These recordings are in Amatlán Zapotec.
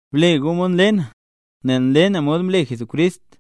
Ble gu mod nle na, nel nle na mod mle Jesucrist.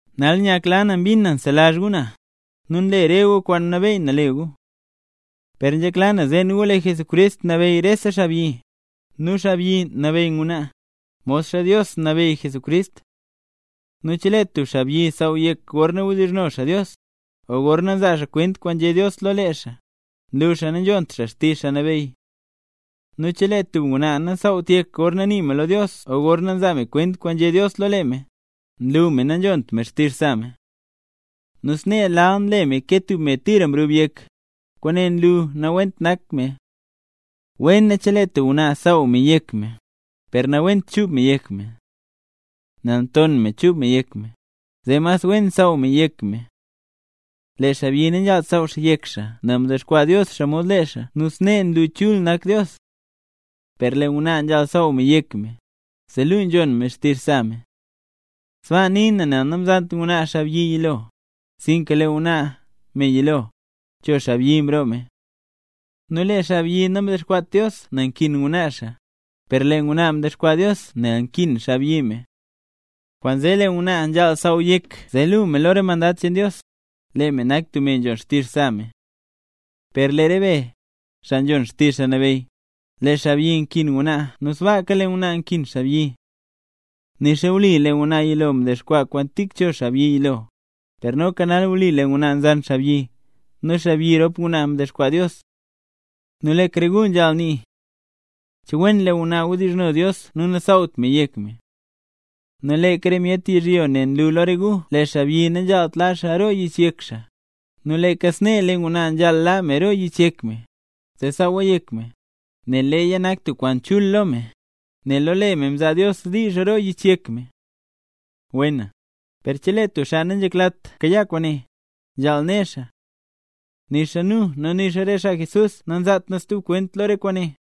Nal nyakla na mbin na nselazh gu na, nu nle gu re kwaan mnabeyy na le gu. Per nzhekla na, zeen gu lee Jesucrist nabeyy rese xaabyi, nu xaabyi nabeyy ngwnaa, modxa Dios nabeyy Jesucrist. Nu chelee tub xaabyi saaw yek gorna wdizhno xaa Dios, o gorna nzaa xaa kwent kwaan nzhé Dios lo lee xaa, nlu xaa nanzhont xaa xtizh Xaa Nabeyy. Nu chelee tub ngwnaa nasaawt yek gorna nii me lo Dios o gorna nzaa me kwent kwaan nzhé Dios lo lee me, nlu me nanzhont me xtizh sa me. Nu snee lal nle me ke tub me tira mrub yek, kwaane nlu nawent nak me. Wena, chelee tub ngwnaa nsaaw me yek me, per nawent chuub me yek me. Nel nton me chuub me yek me, zee mas wen saaw me yek me. Lee xaabyi nanzhaalt saaw xaa yek xaa nel mdexkwaa Dios xaa mod lee xaa nu snee nlu chul nak Dios. Per lee ngwnaa nzhaal saaw me yek me, zee luu nzhon me xtizh sa me. Sbaa nii na nel namzant ngwnaa xaabyi yilo, sinka lee ngwnaa, me yilo, cho xaabyi mroo me. Nu lee xaabyi namdexkwaat Dios nel nkin ngwnaa xaa, per lee ngwnaa mdexkwaa Dios nel nkin xaabyi me. Kwaanzee lee ngwnaa nzhaal saaw me yek me zee luu me lo re mandad cheen Dios, lee me nak tub me nzhon xtizh sa me. Per lee re be, xaa nzhon xtizh Xaa Nabeyy, lee xaabyi nkin ngwnaa nu sbaaka lee ngwnaa nkin xaabyi. Nixa wli lee ngwnaa yilo mdexkwaa kwaan tik cho xaabyi yilo, per noka nal wli lee ngwnaa nzan xaabyi, nu xaabyi rop ngwnaa, mdexkwaa Dios. Nu leeka re gu nzhaal nii, che wen lee ngwnaa wdizhno Dios nu nasaawt me yek me. Nu leeka re myet yizhyo ne nlu lo re gu lee xaabyi nanzhaalt laa xaa roo yich yek xaa, nu leeka snee lee ngwnaa nzhaal laa me roo yich yek me, zee saawa yek me, nel leeya nak tub kwaan chul lo me, nel lo lee me mzaa Dios diizh roo yich yek me. Wena, per chelee tub xaa nanzheklat kayaa kwaane, nzhaal ne xaa, nixa nu, nu nixa re xaa Jesús, nanzaat nu stub kwent lo re kwaane.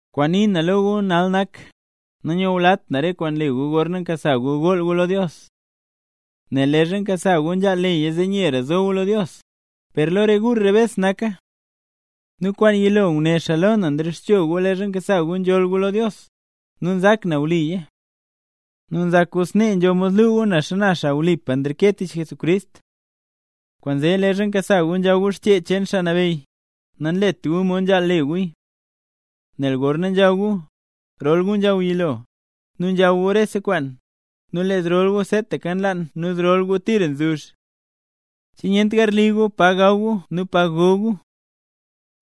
Kwaan nii na lo gu nal nak, nanyulat na re kwaan nle gu gorna nkasa gu gool gu lo Dios. Nel leezha nkasa gu nzhaal leya zee nyera zo gu lo Dios, per lo re gu rebes naka. Nu kwaan yilo, nguné xaa lo na nrexcho gu leezha nkasa gu gool gu lo Dios, nu nzak na wliya. ¿Che nzak gu snee nzho mod luu gu na xana xaa wlipa nreke tich Jesucrist? Kwaanzee leezha nkasa gu nzhaw gu Xchee cheen Xaa Nabeyy, nanlet guya mod nzhaal le guya. Nel gorna nzhaw gu, rol gu nzhaw yilo, nu nzhaw gu rese kwaan, nu lee zrol gu seetaka nlaan nu zrol gu tira nzuzh. ¿Che nyent garli gu pa gaw gu nu pa go gu?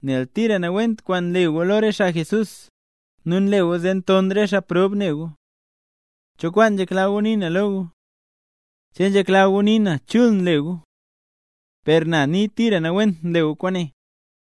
Nel tira nawent kwaan nle gu lo re xaa Jesús, nu nle gu zee nton re xaa prob ne gu. ¿Cho kwaan nzhekla gu nii na lo gu? ¿Che nzhekla gu nii na chul nle gu? ¡Per na nii, tira nawent nle gu kwaane!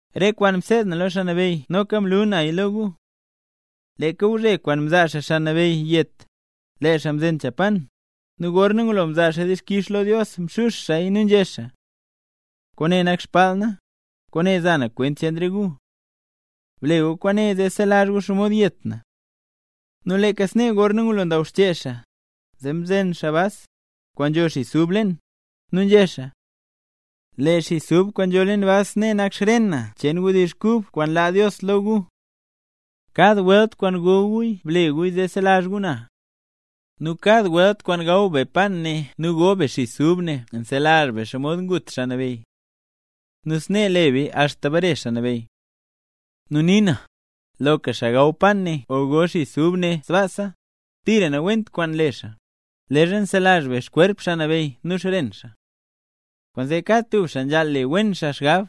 Lee kwaan mseed na lo Xaa Nabeyy noka mlu naya lo gu: Leeka gwzhe kwaan mzaa xaa Xaa Nabeyy yet, lee xaa mzen cha pan, nu gorna ngulo mzaa xaa dixkix lo Dios mxux xaaya nu nzhé xaa: “Kwaane nak xbaal na, kwaane za na kwent cheen re gu. Ble gu kwaane zee selazh gu xomod yet na.” Nu leeka snee gorna ngulo ndaw xchee xaa, zee mzen xaa bas, kwaan nzho xis ub leen, nu nzhé xaa: “Lee xis ub kwaan nzho leen bas ne nak xren na cheen wdizh kub kwaan laa Dios lo gu. Kad welt kwaan go guya ble guya zee selazh gu na.” Nu kad welt kwaan gaw be pan ne nu go be xis ub ne nselazh be xomod ngut Xaa Nabeyy. Nu snee le beya axta bare Xaa Nabeyy. Nu nii na, loka xaa gaw pan ne o go xis ub ne sbaasa, tira nawent kwaan nle xaa leezha nselazh be xkwerp Xaa Nabeyy nu xren xaa. Kwaanzee kad tub xaa nzhaal le wen xaa xgab,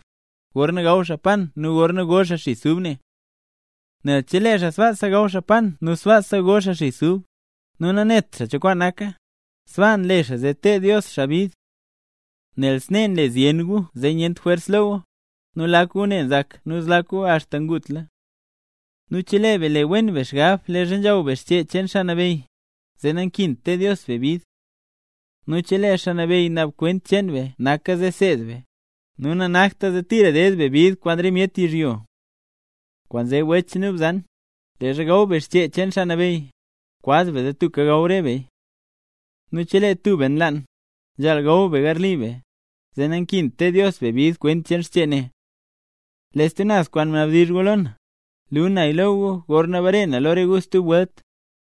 gorna gaw xaa pan ne nu gorna go xaa xis ub ne. Nel chelee xaa sbaasa gaw xaa pan nu sbaasa go xis ub, nu nanet xaa cho kwaan naka, sbaa nle xaa zee teed Dios xaa bid. Nel snee nle zyen gu zee nyent jwers lo gu, nu lak gu ne nzak nu zlak gu axta ngutla. Nu chelee be le wen be xgab leezha nzhaw be Xchee cheen Xaa Nabeyy, zee nankint teed Dios be bid. Nu chelee Xaa Nabeyy naab kwent cheen be naka zee seed be, nu nanakta zee tira ded be bid kwaan re myet yizhyo. Kwaanzee wech nu bzan, leezha gaw be xchee cheen Xaa Nabeyy, kwaz be zee tubka gaw re beya. Nu chelee tub be nlaan, nzhaal gaw be garli be, zee nakint teed Dios be bid kwent cheen xchee ne. Lee stub naz kwaan mnabdizh gu lo na, luu naya lo gu gorna bare na lo re gu stub welt.